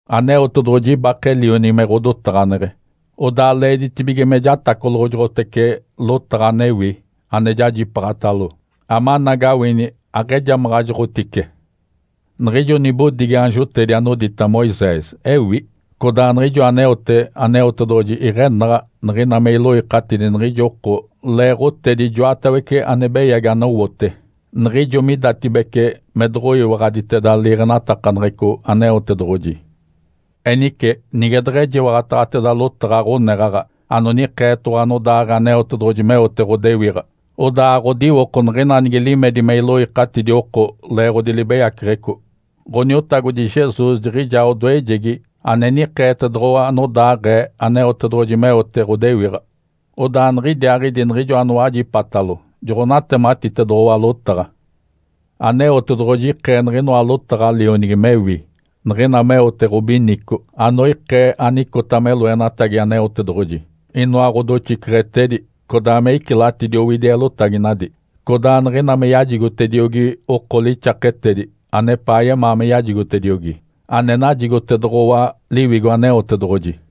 Aneotedoɡ̶oji ibake Lionigi me ɡ̶odotaɡ̶aneɡ̶e, odaa leeditibige me jatacoloɡ̶ojoɡ̶otece lotaɡ̶a anewi ane jajipaaɡ̶atalo, amanagawini aɡ̶ejamaɡ̶ajoɡ̶otice. Niɡ̶ijo nibodigi aanjotedi anodita Moisés ewi, codaa niɡ̶ijo aneote Aneotedoɡ̶oji iɡ̶enaɡ̶a niɡ̶ina me iloikatidi niɡ̶ijo oko leeɡ̶otedi ijoatawece ane beyagi anowote, niɡ̶ijo midatibece me doɡ̶oyiwaɡ̶aditeda liiɡ̶enatakaneɡ̶eco Aneotedoɡ̶oji. Enice nige deɡ̶ejiwaɡ̶ataɡ̶ateda lotaɡ̶a ɡ̶oneɡ̶aɡ̶a anonikeetoɡ̶owa anodaaɡ̶ee Aneotedoɡ̶oji meote ɡ̶odewiɡ̶a, odaa aɡ̶odiwoko niɡ̶ina nige limedi me iloikatidi oko leeɡ̶odi libeyaceɡ̶eco. Ǥoniotagodi Jesus jiɡ̶ijaa odoejegi ane nikeetedoɡ̶owa anodaaɡ̶ee Aneotedoɡ̶oji meote ɡ̶odewiɡ̶a. Odaa niɡ̶idiaaɡ̶idi niɡ̶ijo anowajipatalo joɡ̶onatematitedoɡ̶owa lotaɡ̶a. Aneotedoɡ̶oji ikee niɡ̶inoa lotaɡ̶a Lionigi mewi niɡ̶ina meote ɡ̶obinico anoikee anicota me loenatagi Aneotedoɡ̶oji, inoa ɡ̶odoxiceɡ̶etedi, codaa me icilatidi owidi eelotaginadi, codaa niɡ̶ina me yajigotediogi oko lixaketedi anepaa yemaa me yajigotediogi, ane najigotedoɡ̶owa Liwigo Aneotedoɡ̶oji.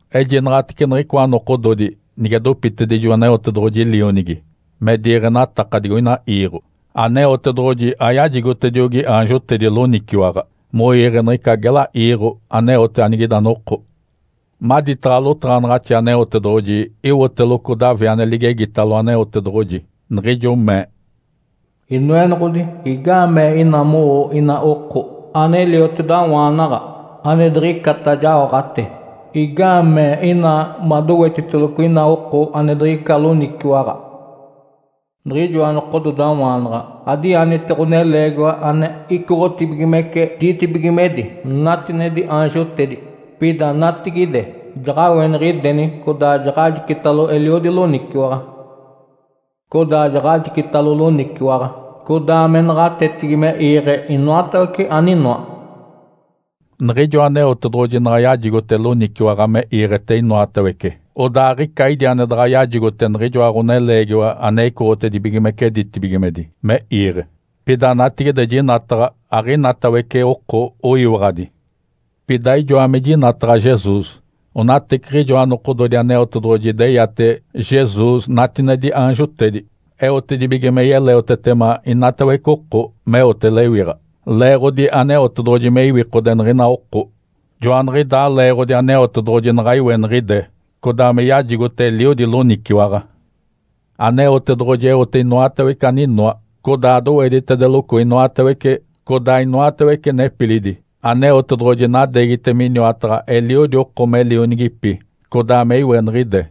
Ejinaɡ̶atece niɡ̶icoa nokododi nige dopitedijo Aneotedoɡ̶oji Lionigi me diiɡ̶enataka digoina iiɡ̶o. Aneotedoɡ̶oji ayajigotediogi aanjotedi loniciwaɡ̶a moiiɡ̶e niɡ̶ica gela iiɡ̶o aneote anigida noko. Maditaɡ̶a lotaɡ̶anaɡ̶axi Aneotedoɡ̶oji, iwoteloco Davi ane ligegitalo Aneotedoɡ̶oji, niɡ̶ijo mee, “Inoenoɡ̶odi, igaamee ina mowoo ina oko, ane liotedawaana, ane diɡ̶icata jaoɡ̶ate? Igaamee ina madowetiteloco ina oko ane diɡ̶ica loniciwaɡ̶a? Niɡ̶ijoa nokododawaanaɡ̶a adianite Ǥoneleegiwa ane icoɡ̶otibigimece ditibigimedi, natinedi aanjotedi. Pida natigide, jaɡ̶aweniɡ̶ideni codaa jaɡ̶ajicitalo eliodi loniciwaɡ̶a. Codaa jaɡ̶ajicitalo loniciwaɡ̶a codaa me naɡ̶atetigi me iiɡ̶e inoatawece aninoa.” Niɡ̶ijo Aneotedoɡ̶oji naɡ̶a yajigote loniciwaɡ̶a me iiɡ̶ete inoatawece, odaa aɡ̶ica idi ane daɡ̶a yajigote niɡ̶ijoa Ǥoneleegiwa ane icoɡ̶otibigimece ditibigimedi me iiɡ̶e. Pida natigide jinataɡ̶a aɡ̶inatawece oko oyiwaɡ̶adi. Pida ijoa me jinataɡ̶a Jesus. Onateciɡ̶ijoa nokododi Aneotedoɡ̶oji ideyate Jesus natinedi aanjotedi, eotedibige me yeleotetema inatawece oko meote lewiɡ̶a, leeɡ̶odi Aneotedoɡ̶oji me iwikode niɡ̶ina oko. Joaniɡ̶idaa leeɡ̶odi Aneotedoɡ̶oji naɡ̶a iweniɡ̶ide codaa me yajigote eliodi loniciwaɡ̶a. Aneotedoɡ̶oji eote inoatawece aninoa codaa doweditedeloco inoatawece, codaa inoatawece nepilidi. Aneotedoɡ̶oji nadeegite miniwataɡ̶a eliodi oko meote me lionigipi, codaa me iweniɡ̶ide.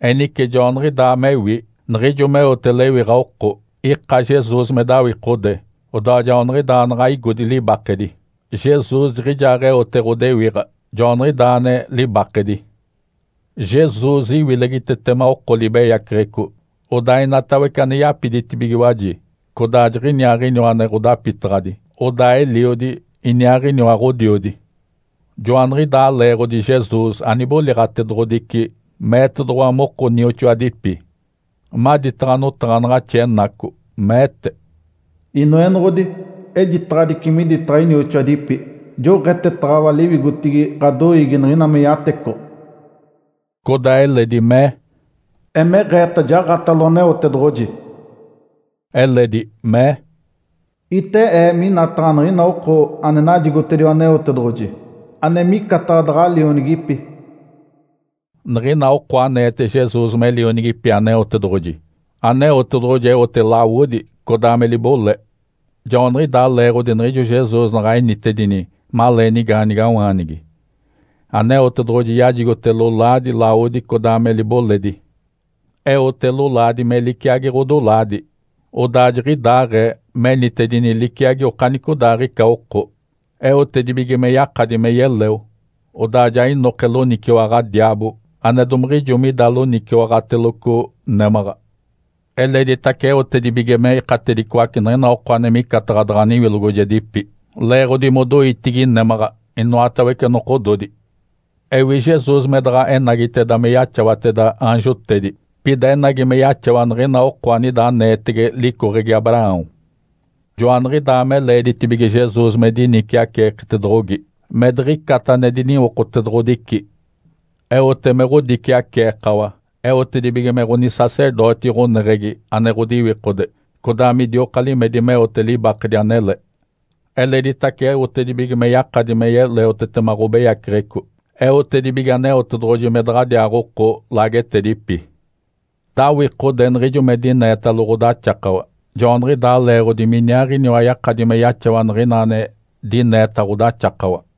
Enice joaniɡ̶idaa mewi, niɡ̶ijo meote lewiɡ̶a oko, ika Jesus, me dawikode, odaa joaniɡ̶idaa naɡ̶a igodi libakedi. Jesus jiɡ̶ijaaɡ̶eote ɡ̶odewiɡ̶a, joaniɡ̶idaa ane libakedi. Jesus iwilegitetema oko libeyaceɡ̶eco. Odaa inatawece ane yapiditibigiwaji, codaa jiɡ̶iniaaɡ̶iniwa ane ɡ̶odapitaɡ̶adi, odaa Eliodi, iniaaɡ̶iniwa Ǥodiodi. Joaniɡ̶idaa leeɡ̶odi Jesus aniboliɡ̶atedoɡ̶odici meetedoɡ̶owa moko nioxoadipi. Maditaɡ̶a notaɡ̶anaɡ̶axi enaco, meete, “Inoenoɡ̶odi, ejitaɡ̶adici miditaɡ̶a inioxoadipi. Joɡ̶etetaɡ̶awa liwigotigi ɡ̶adoiigi niɡ̶ina me yatecoɡ̶o.” Codaa eledi mee, “Emeɡ̶eeta jaɡ̶atalo Aneotedoɡ̶oji.” Eledi mee, “Ite Ee minataɡ̶a niɡ̶ina oko ane najigotediwa Aneotedoɡ̶oji, ane micataɡ̶a daɡ̶a lionigipi.” Niɡ̶ina oko aneete Jesus me lionigipi Aneotedoɡ̶oji, Aneotedoɡ̶oji eote lawodi codaa me libole. Joaniɡ̶idaa leeɡ̶odi niɡ̶ijo Jesus naɡ̶a enitedini malee nigaanigawaanigi, Aneotedoɡ̶oji yajigote lolaadi, lawodi codaa me liboledi. Eote lolaadi me liciagi ɡ̶odolaadi. Odaa jiɡ̶idaaɡ̶ee menitedini liciagi okanicodaaɡ̶ica oko, eotedibige me yakadi me yeleo, odaa ja inoke loniciwaɡ̶a diaabo ane domiɡ̶ijo mida loniciwaɡ̶ateloco némaɡ̶a. Eleditace eotedibige me ikatedicoace niɡ̶ina oko ane micataɡ̶a daɡ̶a niwilogojedipi leeɡ̶odi modoitigi némaɡ̶a inoatawece nokododi. Ewi Jesus me daɡ̶a enagiteda me yaxawateda aanjotedi. Pida enagi me yaxawa niɡ̶ina oko anida aneetege licoɡ̶egi Abraão. Joaniɡ̶idaa me leeditibige Jesus me diniciaceeketedoɡ̶ogi, me diɡ̶icata ane diniwokotedoɡ̶odici. Eote me ɡ̶odiciaceekawa, eotedibige me ɡ̶onisacerdoti ɡ̶oneɡ̶egi ane ɡ̶odiwikode codaa midioka limedi meote libakedi anele. Eleditace eotedibige me yakadi me yeleotetema ɡ̶obeyaceɡ̶eco, eotedibige Aneotedoɡ̶oji me daɡ̶adiaaɡ̶oko laagetedipi. Dawikode niɡ̶ijo me dineetalo ɡ̶odaxakawa, joaniɡ̶idaa leeɡ̶odi miniaaɡ̶iniwa yakadi me yaxawa niɡ̶ina ane dineeta ɡ̶odaxakawa.